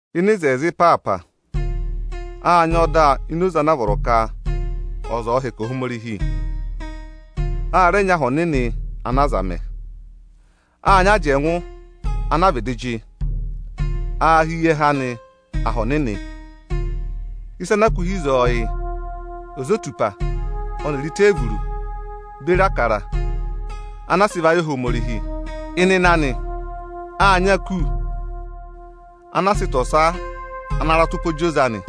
Ịnị oto ịpaapa, â nyị ọda ini oze ana a vọrọ ka ọza ọ̀ọ hẹkẹ Ohomorihi. A rẹ nyị aha ọnịnị ana aza mẹ. Â nyị ajẹngụ ana a vịdị jị. Aā hị́ eyi ẹhẹ anị Aha Ọnịnị. Ịsa ana a kụ́ hi ịzọọ, yị: ozotupa ọnịrị iteevuru beri Ịbụrẹẹdị ana a sị va yị Ohomorihi. Ịnịnẹ anị, â nyị aku ana a sị ịta ọsa ana ratụpọ jị oze anị.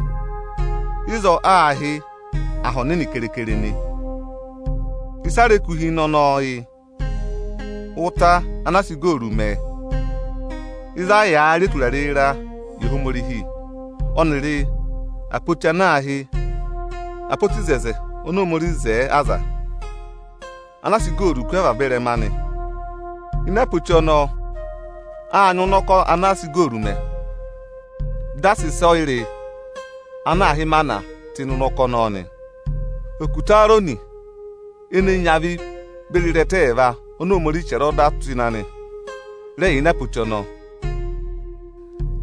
Ịzọọ aā hị́ Aha Ọnịnị keekere nị. Ịsị a rẹ kụ́ hi ịnị ọnọọ yị: ụta ana a sị igooru mẹ ịzị a yàā rị eturare ịraa yị Ohomorihi, ọnịrị apoti ana aā hị́ apoti oto Ohomorihi ana a sị igooru kú avaba ịrẹma anị. Ini apoti ọnọọ â nyị ụnọkọ ana a sị igooru mẹ, dị a sị ịsọyịrị ana aā hị́ ịmana tụ́ ịnị ụnọkọ ọnọọ nị. Okutẹ Eerọnị ene nyị avị beri ịrẹta ẹẹva oni Ohomorihi chẹrẹ ọda tụ́ ịnị anị, rẹ yà ini apoti ọnọọ.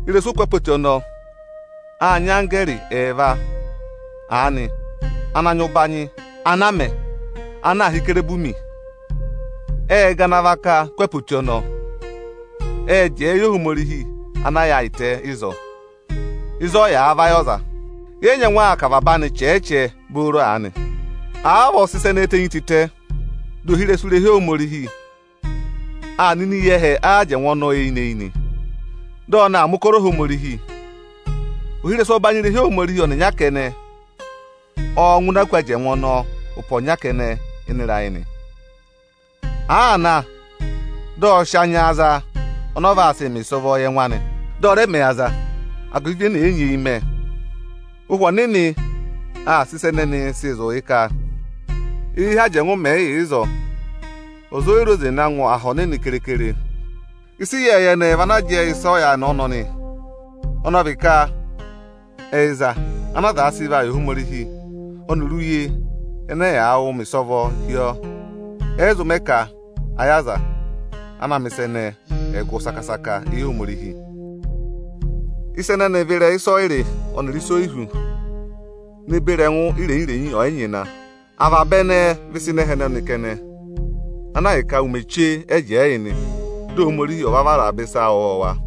Ị́rẹsụ oku apoti ọnọọ â nyị anggẹẹrị ẹẹva aanị ana nyị ụbanyị ana a mẹ, ana aā hị́ Ikerubimi. Ệ gana avaka kú apoti ọnọọ. Ệ jẹẹ yị Ohomorihi ana yaayịtẹ ịzọọ, ịzị ọ yàā vayị aza nị. Yẹ yị nyẹngụ aa kà avaba anị chẹẹ-chẹẹ booro aanị. Àa vavọọ sị ịsa ẹnẹẹ tenyi tịtẹ, dị ohirẹsụ irehi Ohomorihi aa nọ ini eyi ẹhẹ ajẹngụ ọnọọ eyinị-eyinị, dị ọ na aa mẹ̀ ụkọrọ Ohomorihi. Ohirẹsụ ọbanyị irehi Ohomorihi ọnịnya kẹnẹ ọọ̄ ngụ ini aku ajẹngụ ọnọọ ụpẹ ọnya kẹnẹ ịnị ịrayị nị. Àaa na, dị ọ sị anya za ọnị ọ vaa sị mẹ ịsọvọọ yị ẹngụ anị, dị ọ̀ rẹ mẹ yị aza agụvị ịvị ene e nyeeyi mẹ. Ụhwẹ Ọnịnị aa sị ịsa ẹnẹnị sịị zụ̀ yị ka, éyi ẹhẹ ajẹngụ mẹ̀ yị yà ịzọọ, ọza o yi re oze na ngụ Aha Ọnịnị keekere. Ịsa ịyẹẹyẹ ẹnẹẹ vị ana jẹẹ yị ịsa ọyaanị ọnọnị. Ọnị ọ vị ka ẹyịza ana aza sị va yị Ohomorihi, ọnịrị uye ẹnẹ ẹyaa wụụ mẹ ịsọvọọ hi ọọ, ẹyị zụ mẹ ka ayị aza ana aa mẹ̀ ịsa ẹnẹẹ, ẹ̀ gụ saka-saka éyi Ohomorihi. Ịsa ẹnẹnị vị ịrẹyị ịsọyịrị ọnịrị ịsa oyihú ne beri ẹngụ irenyi-irenyi ọyịnyịna. Avaba ẹnẹẹ vị ịsa ịnị ẹhẹ ọnọnị kẹnẹ, ana ahịka ụmẹ chee ẹ jẹẹ yị nị, dị Ohomorihi ọ̀ va vara avaba ịsa ọwọọwa.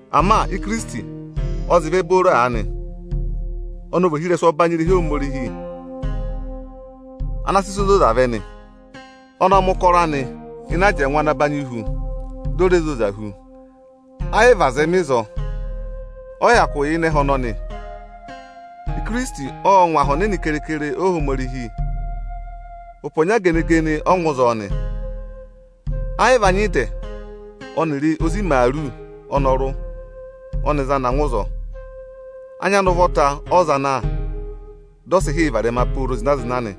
Ama Ikirisiti ọ zị vẹ booro aanị. Ọnị ọ vị ohirẹsụ ọbanyị irehi Ohomorihi ana aa sị ịsa ozozaa vẹ nị. Ọnị ộ mẹ̀ ụkọrọ anị ịnị ajẹngụ ana banyị hu, di o re zoza hu. Ẹ yị vị aza ẹ mẹ ịzọọ, ọ yị hyakụ yà ịnị ẹhẹ ọnọnị. Ikirisiti ộ ngụ Aha Ọnịnị keekere Ohomorihi. Ụpẹ ọnya gene-gene ọ ngụ ịzọọ nị. Ẹ yị vị anya ịdẹ ọnịrị ozi imaaru ọnọrụ ọnị za na ngụ ịzọọ. Anya anị ụvọta ọ za na, dị ọ sị hị́ yị varẹma pooro zịna-zịna nị.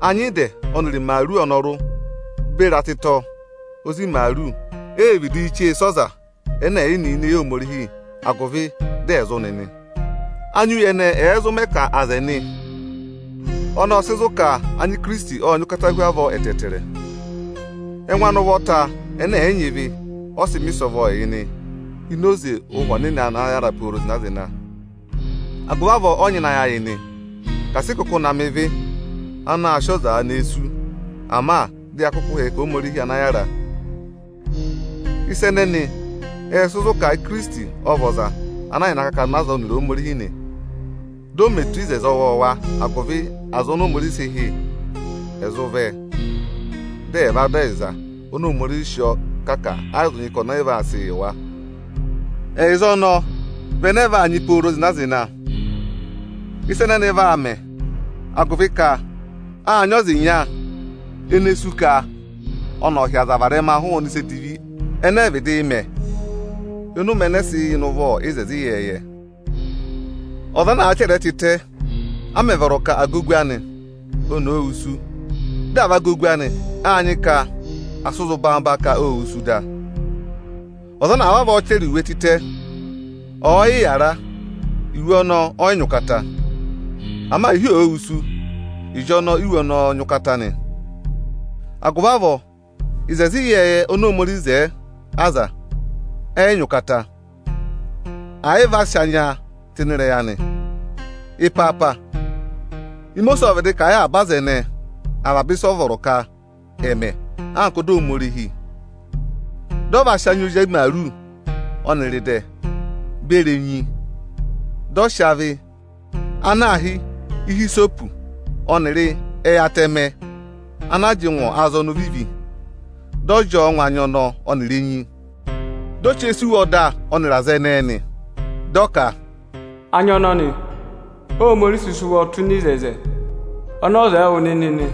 Anya ịdẹ ọnịrị imaaru ọnọrụ beri atịtọ ozi imaaru e vidiī chee sẹ́ ọza ẹnẹ ẹ̀ yị nị ini eyi Ohomorihi, agụvị dị ẹ̀ zụ nị nị. Anya uye ẹnẹ ẹ̀ẹ zụ mẹ ka aza ẹ̀ nị, ọnọọ ọ́ọ sị zụ̀ ka anya Ikirisiti ọ́ọ nyị ụkata hu avọọ ẹtẹẹtẹrẹ. Ẹngụ anị ụvọta ẹnẹ ẹ̀ yị nyị ịvị ọ sị mẹ ịsọvọọ yị nị ini oze Ụhwẹ Ọnịnị ana yàra pooro zịna-zịna. Agụvị avọọ ộ nyịna ayị ayị nị, ka asị ị kụkụ na mẹ ịvị, anaā sịị ọza nee sú; ama dị ya kụkụụ hẹkẹ Ohomorihi ana yára. Ịsa ẹnẹnị ẹ́ẹ sị zụ̀ ka Ikirisiti ọ vị ọza ana yà ịnị akakana aza ọnịrị Ohomorihi nị, dị ọ mẹ eto oto ọwọọwa, agụvị aza oni Ohomorihi sị hị́, ẹ̀ zụ vẹ, dị ẹ̀ va dọ ẹyịza oni Ohomorihi sị ọọ kà ka ẹ yị zụ nyị ka ọnị ọyị vaa sịị yị wa. Ẹyịza ọnọọ vị ẹnẹẹ vaa nyị pooro zịna-zịna. Ịsa ẹnẹnị vaa mẹ, agụvị ka áa nyị ọza ịnya ene sú ka ọnị ọ̀ hị́ aza varẹma hụụnị ịsa edivi ẹnẹ ẹ vịdịị mẹ ịnị ụmẹ ẹnẹ ẹ sị yà ịnị ụvọ oto ịyẹẹyẹ. Ọza ọ̀ọ naa chẹrẹ ẹ tịtẹ a mẹ̀ vọrọ ka à gà ogu anị, oni òo wusu, dị à va gà ogu anị, áa nyị ka à sị zụ̀ gedebee ka ô wusu da. Ọza ana vavọọ chẹrẹ iwe tịtẹ, ọ̀ọ yị yàra, iwe ọnọọ ọ yị nyị ụkata. Ama ịhị òo wusu, ịjọnọọ íwe ọnọọ nyị ụkata nị. Agụvị avọọ oto ịyẹẹyẹ oni Ohomorihi zẹẹ aza, ẹ yị nyị ụkata, àyị vị a sị anya tụ́ ịnị ịrẹyị anị. Ịpaapa, Imosiisi ộ vịdị kà a yị avaba aza ẹnẹẹ avaba ịsa a vọrọ ka ẹ̀ mẹ anka ọda Ohomorihi. Dị ọ va sị anya ozi imaaru ọnịrị ịdẹ beri enyi, dị ọ sị avị ana aā hị́ ihisopu ọnịrị ẹyị atẹmẹ ana a jị ngụ azọnọ ovivi, dị ọ jị ọọ ngụ anya ọnọọ ọnịrị enyi, di o chee sẹ́ iwe ọda ọnịrị aza ẹnẹẹ nị. Dị ọ ka, “Anya ọnọnị Óhomorihi sị sị ụvọ tụ́ ịnị oto oni o wo yị wụ nịnị nị.”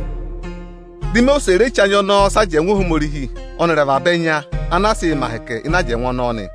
Dị Imosiisi re che anya ọnọọ sẹ́ ajẹngụ Ohomorihi ọnịrị avaba ẹnya ana a sịị̄ mẹ ahẹkẹ ịnị ajẹngụ ọnọọ nị.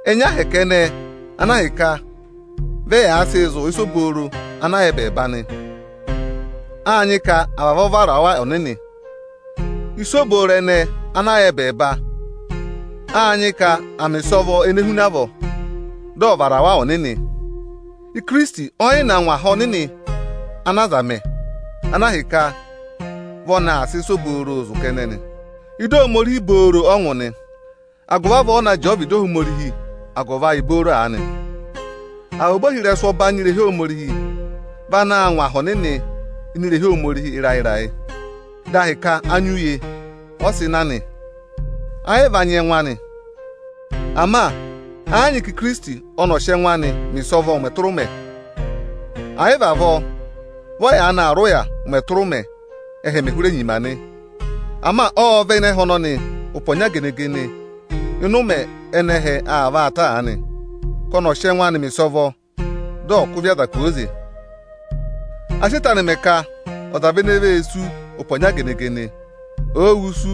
Ẹnya ahẹkẹ ẹnẹẹ ana ahịka vị ẹyaa sịị zụ̀ ịsa obooro ana yà ẹbẹẹba nị; áa nyị ka à vavọọ vara wa ọnịnị. Ịsa obooro ẹnẹẹ ana yà ẹbẹẹba, áa nyị ka à mẹ̀ ịsọvọ ene huna avọọ, dị ọ vara wa ọnịnị. Ikirisiti ọ́ yị na ngụ aha ọnịnị ana aza mẹ, ana ahịka vị ọnị aa sị ịsa obooro zụ̀ kẹnẹ nị. Ịdị Ohomorihi booro ọ ngụ nị, agụvị avọọ ọ na jẹẹ ọvịdị Ohomorihi agụvị ayị booro aanị nị. Avaba ohirẹsụ ọbanyị irehi Ohomorihi vị anaā ngụ Aha Ọnịnị (ini irehi Ohomorihi) ịrayị-ịrayị. Dị a hị́ ka anya uye ọ sị na nị, ayị vị anya ẹngụ anị. Ama ẹ yị nyị ka Ikirisiti ọnị ọ̀ọ sị ẹngụ anịị mẹ̀ ịsọvọ ụmẹ tụra ụmẹ. Àyị vị avọọ, vị ọ yaanị aa rị ụya ụmẹ tụra ụmẹ, ẹ́hẹ mẹ̀ hụrẹ nyima nị. Ama ộ vẹ ịnị ẹhẹ ọnọnị ụpẹ ọnya gene-gene ịnị ụmẹ ẹnẹ ẹhẹ aa vaa ta aanị, ka ọnị ọ̀ sị ẹngụ anị mẹ̀ ịsọvọ, dị ọ̀ kụ́ ịvị aza kwooze. A sị eto anị mẹ ka ọza vị ene vee sú ụpẹ ọnya gene-gene. Òo wusu,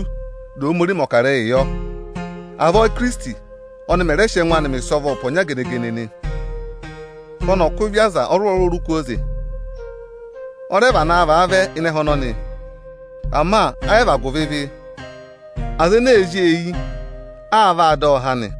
dị Ohomorihi mẹ̀ ọkarẹyị yọ. Avọọ Íkirisiti ọnị mẹ̀ rẹ sị ẹngụ anị mẹ̀ ịsọvọ ụpẹ ọnya gene-gene nị, ka ọnị ọ̀ kụ́ ịvị aza ọrụrụ-ọrụrụ kwooze. Ọ rẹ vanaa vaa vẹ ịnị ẹhẹ ọnọnị, ama ayị vị agụvị ịvị. Aza ene ee zí ọọ eyi, aa vaa dọ ọ há nị.